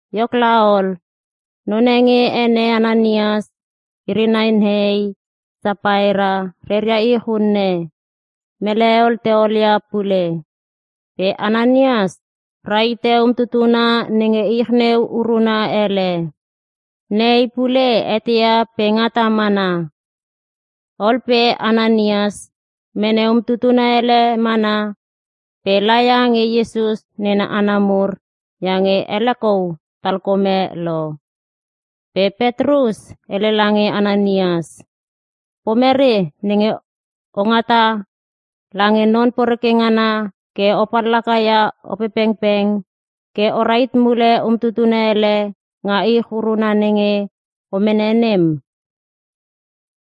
Iok laol, none nge ene Ananias iri nai nehei Sapaera reria ich unne, mele hel te olia pule. Pe Ananias rahite umtutuna nenge ich neu uruna ele. Nehei pule eteia pe ngata mana. Ol pe Ananias mene umtutuna ele mana, pe laia nge Iesus nena hana mur iange ele kou talkome lo. Pe Petrus hele lange Ananias, “Pomere nenge ongata lange Non Poreke ngana ke o pallakaia Opepengpeng, ke o rahit mule umtutuna ele nga ich uruna nenge o mene nem?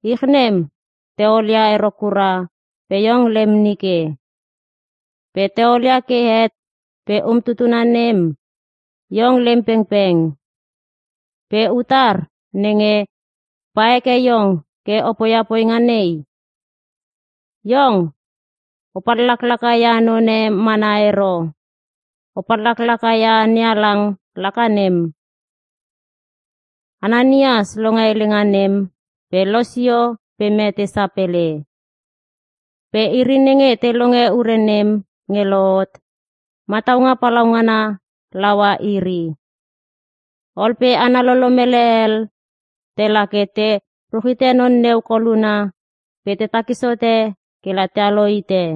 Ich nem te olia ero kura pe iong lem nike. Pe te olia ke het pe umtutuna nem, iong lem pengpeng. Pe utar nenge pa heke iong ke o poia poinga nei? Iong o pallaklaka ia none mana ero, o pallakaia NeHalang laka nem.” Ananias longe helenga nem, pe losio pe mete sapele. Pe iri nenge te longe ure nem nge lohot, mataunga palaungana laua iri. Ol pe hana lolomele hel tela ke te ruchite non neu koluna pe te takis hote kela tealo hite.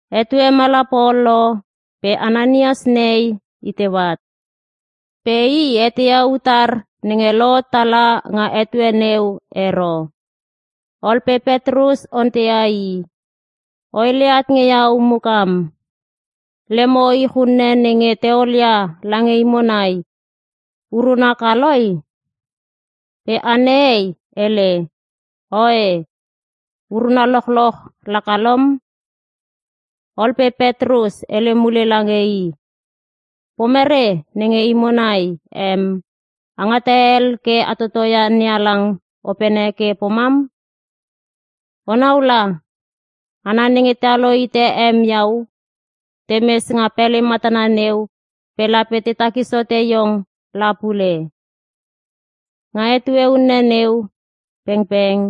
Etue mala pol lo pe Ananias nehei iteu at. Pe i eteia utar nenge lohot tala nga etue neu ero. Ol pe Petrus onteia i, “O hele at nge iau mukam, lemo ich unne nenge te olia lange imo nai, uruna kaloi?” Pe ana hei hele, “Oe, uruna lochloch lakalom.” Ol pe Petrus hele mule lange i, “Pomere nenge imo nai em a ngata hel ke a totoia NeHalang opene ke pomam? Onau la, hana nenge tealo hite em iau temes nga pele matana neu pe lape te takis hote iong la pule!” Nga etue unne neu pengpeng,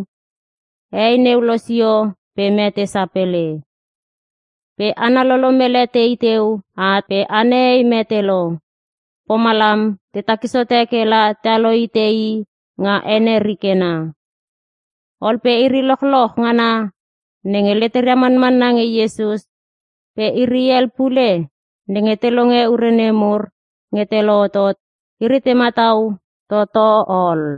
hei neu losio pe mete sapele. Pe hana lolomele tei teu at pe ana hei mete lo, pomalam te takis hote kela tealo hite i nga ene rikena. Ol pe iri lochloch ngana nenge leteria manmanna nge Iesus, pe iri hel pule nenge te longe ure nemur nge te lohotot, iri te matau toto ol.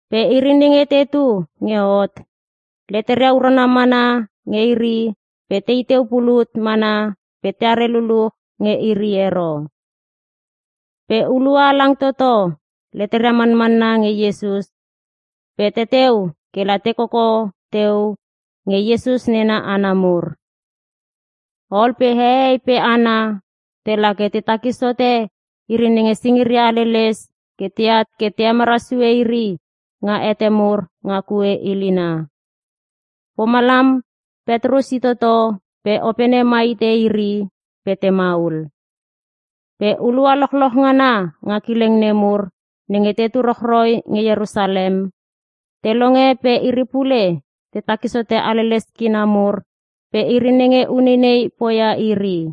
Pe iri nenge te tu nge hot, leteria urana mana nge iri pe teteu pulut mana pe teare luluch nge iri ero. Pe hulua halang toto, leteria manmanna nge Iesus pe teteu kela te koko teu nge Iesus nena hana mur. Ol pe hehei pe hana tela ke te takis hote iri nenge singiria haleles ke teat ke te emara sue iri nga hete mur nga kue ilina. Pomalam, Petrus itoto pe opene ma hite iri pe temaul. Pe hulua lochlolch ngana nga kileng nemur nenge tetu rochroi nge Ierusalem, te longe pe iri pule te takis hote haleles kina mur pe iri nenge uneinei poia iri.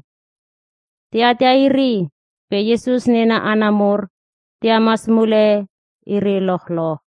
Te atia iri pe Iesus nena hana mur te hemas mule iri lochloch.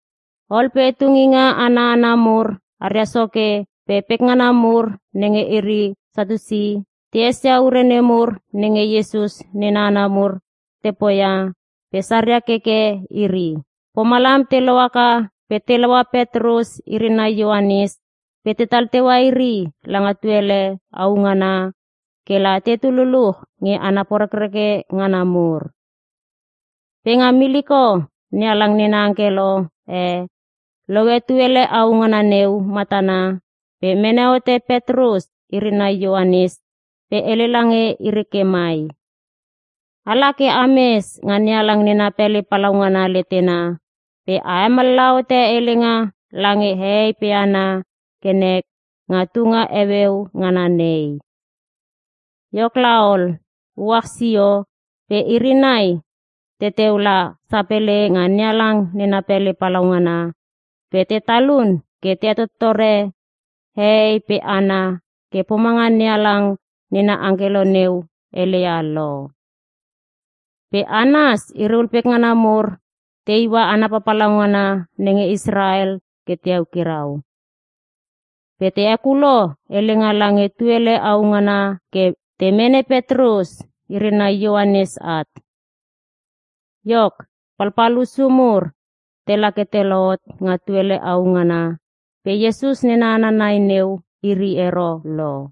Ol pe tunginga ana hana mur aria soke pe pekngana mur nenge iri Satiusi, te esia ure nemur nenge Iesus nena hana mur te poia pe saria keke iri. Pomalam te lohaka pe telaua Petrus iri nai Ioanes pe tetal teua iri langa tuele au ngana, kela tetu luluch nge hana porekreke ngana mur. Pe nga miliko NeHalang nena angkelo e loe tuele au ngana neu matana pe mene hote Petrus iri nai Ioanes pe hele lange iri ke mai, “Ala ke a mes nga NeHalang nena pele palaungana letena pe a hemallaha hote helenga lange hehei pe hana ke nek nga tunga heueu ngana nei.” Iok laol, uach sio pe iri nai teteu la sapele nga NeHalang nena pele palaungana pe te talun ke te hetottore hehei pe hana ke pomanga NeHalang nena angkelo neu heleia lo. Pe Anas iriul pekngana mur te iua hana papalauna nenge Israel te eukirau. Pe te hekulo helenga langa tuele au ngana ke te mene Petrus iri nai Ioanes at. Iok palpal hussu mur tela ke te lohot nga tuele au ngana pe Iesus nena hana nai neu iri ero lo.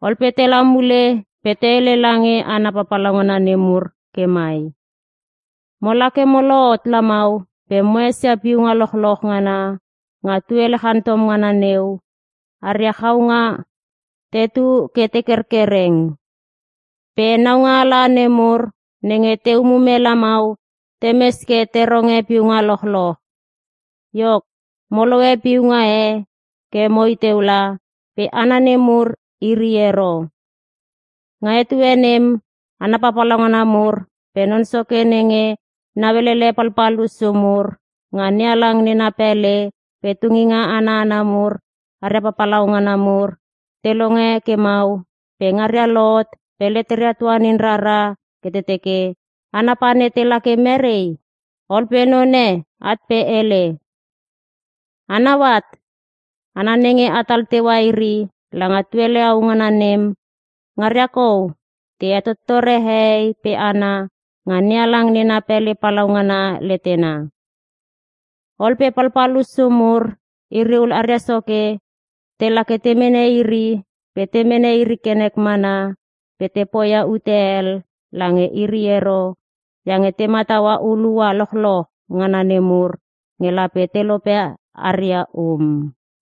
Ol pe tela mule pe te hele lange hana papalauna nemur ke mai, “Mola ke mo lohot lamau pe mo esia piunga lochloch ngana nga tuele chantom ngana neu, aria chaunga tetu ke tekerkereng. Pe naualanga nemur nenge te umume lamau, temes ke te ronge piunga lochloch. Iok, mo lohe piunga e ke moi teu la, pe hana nemur iri ero.” Nga etue nem, hana papalauna mur pe non soke nenge nauelele palpal hussu mur nga NeHalang nena pele pe tunginga ana hana mur aria papalauna mur te longe ke mau, pe ngaria lohot pe leteria tuanin rara ke te teke, hana pane tela ke merei? Ol pe none at pe hele, “A nau at, hana nenge atal teua iri langa tuele au ngana nem, ngaria kou te hetottore hehei pe hana nga NeHalang nena pele palaungana letena.” Ol pe palpal hussu mur iriul aria soke, tela ke te mene iri pe te mene iri ke nek mana pe te poia ute hel lange iri ero, iange te mataua hulua lochloch ngana nemur nge lape telope aria um.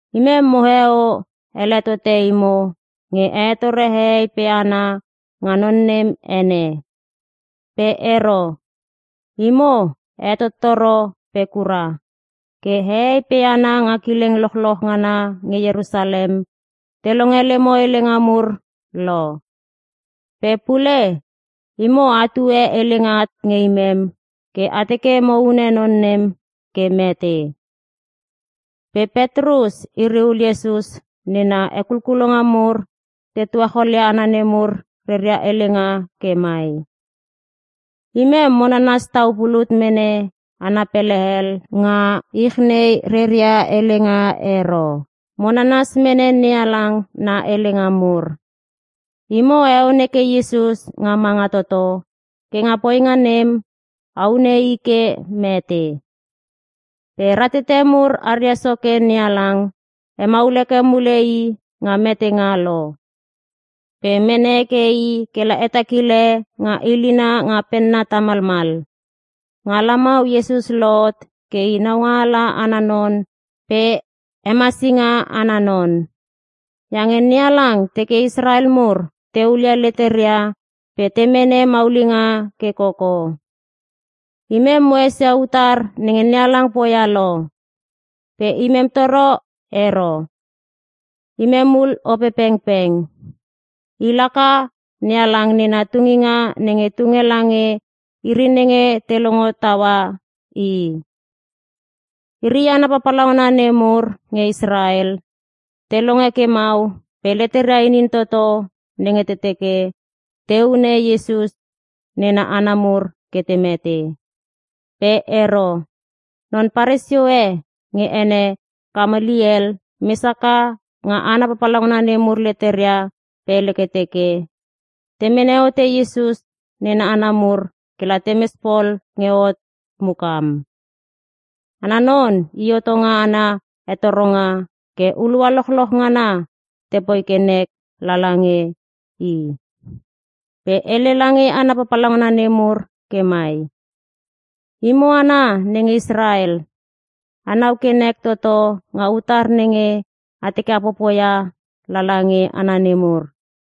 “Imem moheo ele tote imo nge a hetore hehei pe hana nga non nem ene. Pe ero. Imo a hetottoro pe kura, ke hehei pe hana nga kileng lochloch ngana nge Ierusalem te longe lemo helenga mur lo. Pe pule, imo a tue helenga at nge imem ke a teke mo hune non nem ke mete.” Pe Petrus iri ul Iesus nena hekulkulonga mur te tuacholia hana nemur reria helenga ke mai, “Imem mo nanas tau pulut mene hana pele hel nga ich nei reria helenga ero. Mo nanas mene NeHalang na helenga mur!” Imo a heon heke Iesus nga manga toto, ke nga poinga nem, a hune i ke mete. Pe ratete mur aria Soke NeHalang hemaul heke mule i nga metenga lo. Pe mene heke i kela hetakile nga ilina nga penna tamalmal. Nga lamau Iesus lohot ke i naungaala ana non pe hemasinga ana non. Iange NeHalang teke Israel mur te hulia leteria pe te mene maulinga ke koko. Imem mo esia utar nenge NeHalang poia lo. Pe imem toro ero. Imem ul Opepengpeng. I laka, NeHalang nena tunginga nenge tunge lange iri nenge te longo taua i. Iri hana papalauna nemur nge Israel, te longe ke mau pe leteria inin toto nenge te teke te hune Iesus nena hana mur ke te mete. Pe ero, Non Paresio e nge ene Kamaliel mes haka nga hana papalauna nemur leteria pe hele ke teke, te mene hote Iesus nena hana mur kela temes pol nge hot mukam. Ana non i hotonga ana hetoronga ke hulua lochloch ngana tepoi ke nek lala nge i. Pe hele lange hana papalauna nemur ke mai, “Imo hana nenge Israel, anau ke nek toto nga utar nenge a teke a popoia lala nge hana nemur.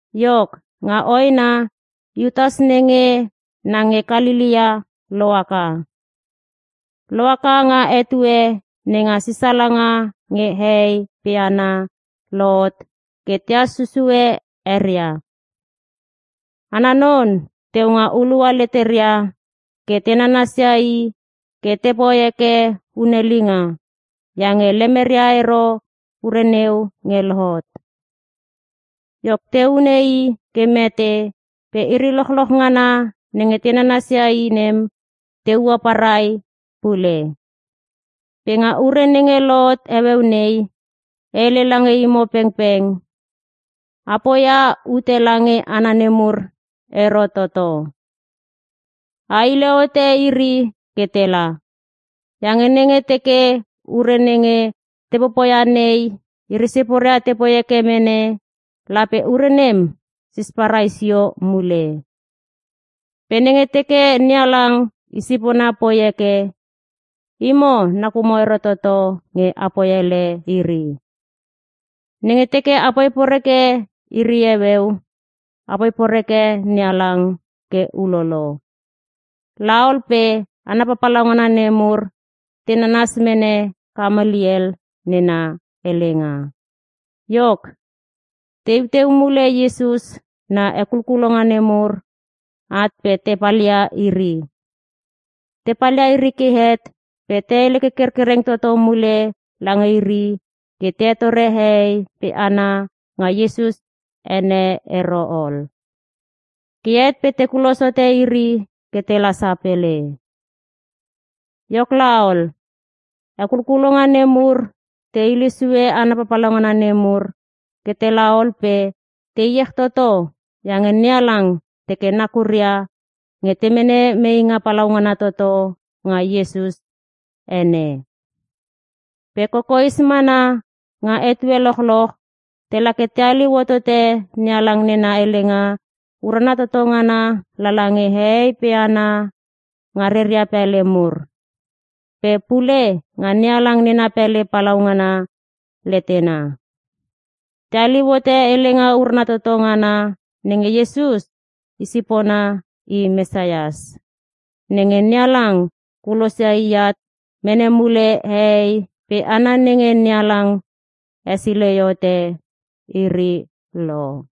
Iok, nga hoena Iutas nenge na nge Kalelea lohaka. Lohaka nga etue nenga sisalanga nge hehei pe hana lohot, ke tehas susue eria. Ana non teu nga hulua leteria ke te nanasia i ke tepoi heke hunelinga, iange lemeria ero ure neu nge lohot. Iok te hune i ke mete pe iri lochloch ngana nenge te nanasia i nem te ua parai pule. Pe nga ure nenge lohot heueu nei, e hele lange imo pengpeng, a poia ute lange hana nemur ero toto. A hile hote iri ke tela! Iange nenge teke ure nenge te popoia nei, iri siporia tepoi heke mene, lape ure nem sisparai sio mule. Pe nenge teke NeHalang i sipona poi heke, imo nakumo ero toto nge apoi ele iri. Nenge teke apoi poreke iri heueu, apoi poreke NeHalang ke ulolo!” Laol pe hana papalauna nemur te nanas mene Kamaliel nena helenga. Iok, teiu teu mule Iesus na hekulkulonga nemur at pe te palia iri. Te palia iri ke het pe te hele ke kerkereng toto mule lange iri ke te hetore hehei pe hana nga Iesus ene ero ol. Ke het pe te kulos hote iri ke tela sapele. Iok laol, hekulkulonga nemur te hile sue hana papalauna nemur ke tela ol pe te iech toto iange NeHalang teke nakuria nge te mene meinga palaungana toto nga Iesus ene. Pe kokoes mana nga etue lochloch tela ke te haliu hotote NeHalang nena helenga urana toto ngana lala nge hehei pe hana nge reria pele mur, pe pule nga NeHalang nena pele palaungana letena. Te haliu hote helenga urana toto ngana nenge Iesus i sipona i Mesias, nenge NeHalang kulosia ke at mene mule hehei pe hana nenge NeHalang hesilei hote iri lo.